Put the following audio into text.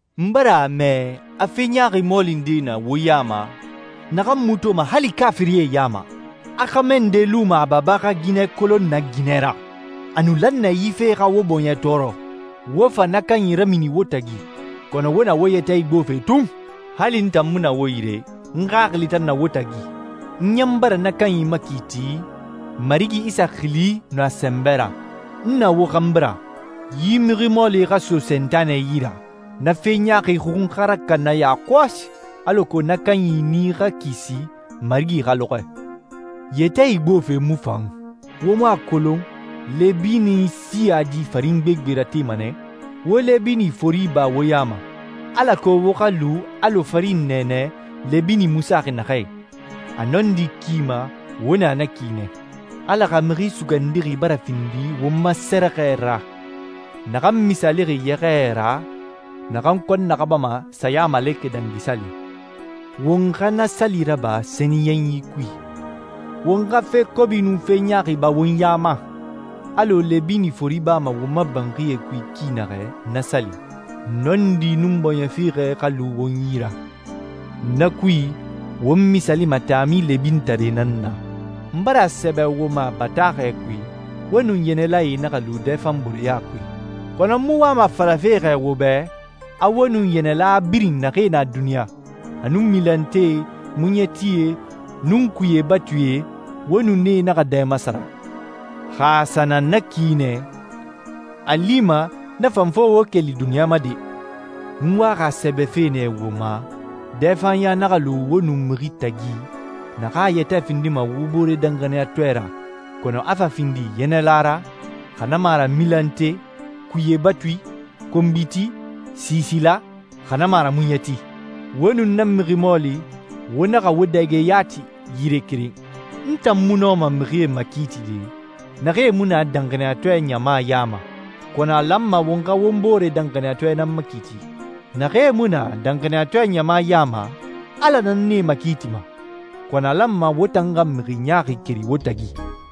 N bara a mɛ a fe ɲaaxi mɔɔli nde na wo ya ma, naxan mu toma hali kaafirie ya ma. A xɛmɛ nde luma a baba xa ginɛ kolon na ginɛ ra. A nu lan nɛ yi fe xa wo bɔɲɛ tɔɔrɔ, wo fa na kanyi ramini wo tagi, kɔnɔ wo na wo yɛtɛ igbofe tun. Hali n tan mu na wo yire, n xaxili tan na wo tagi. N ɲan bara na kanyi makiiti Marigi Isa xili nun a sɛnbɛ ra. N na wo xanbi ra. Yi mixi mɔɔli xa so Sentanɛ yi ra, na fe ɲaaxi xun xa rakana yakɔsi, alako na kanyi nii xa kisi Marigi xa lɔxɔɛ. Yɛtɛ igbofe mu fan. Wo mu a kolon lɛbini siyadi farin gbegbe ratema nɛ? Wo lɛbini fori ba wo ya ma, alako wo xa lu alɔ farin nɛɛnɛ lɛbini mu saxi naxɛ i. A nɔndi ki ma wo na na ki nɛ. Ala xa Mixi Sugandixi bara findi won ma sɛrɛxɛ ra, naxan misaalixi yɛxɛɛ ra naxan kɔn naxabama Sayamalekɛ Dangi Sali. Won xa na sali raba sɛniyɛnyi kui. Won xa fe kobi nun fe ɲaaxi ba won ya ma, alɔ lɛbini fori bama won ma banxie kui ki naxɛ na sali. Nɔndi nun bɔɲɛ fiixɛ xa lu won yi ra. Na kui won misaalima taami lɛbinitare nan na. N bara a sɛbɛ wo ma bataaxɛ kui, wo nun yɛnɛlae naxa lu dɛfanbooreya kui. Kɔnɔ n mu wama a falafe xɛ wo bɛ a wo nun yɛnɛla birin naxee na duniɲa, a nun milantee, muɲɛtie, nun kuye batuie, wo nun nee naxa dɛ masara. Xa a sa na na ki nɛ, a lima na fan fo wo keli duniɲa ma de! N waxi a sɛbɛfe nɛ wo ma, dɛfanɲa naxa lu wo nun mixi tagi, naxan a yɛtɛ findima wo boore danxaniyatɔɛ ra, kɔnɔ a fa findi yɛnɛla ra, xa na mu a ra milante, kuye batui, konbiti, siisila, xa na mu a ra muɲɛti. Wo nun na mixi mɔɔli, wo naxa wo dɛge yati yire keren. N tan mu nɔma mixie makiitide naxee mu na danxaniyatɔɛ ɲama ya ma, kɔnɔ a lanma won xa won boore danxaniyatɔɛe nan makiiti. Naxee mu na danxaniyatɔɛ ɲama ya ma, Ala nan nee makiitima, kɔnɔ a lanma wo tan xa «mixi ɲaaxi keri wo tagi.»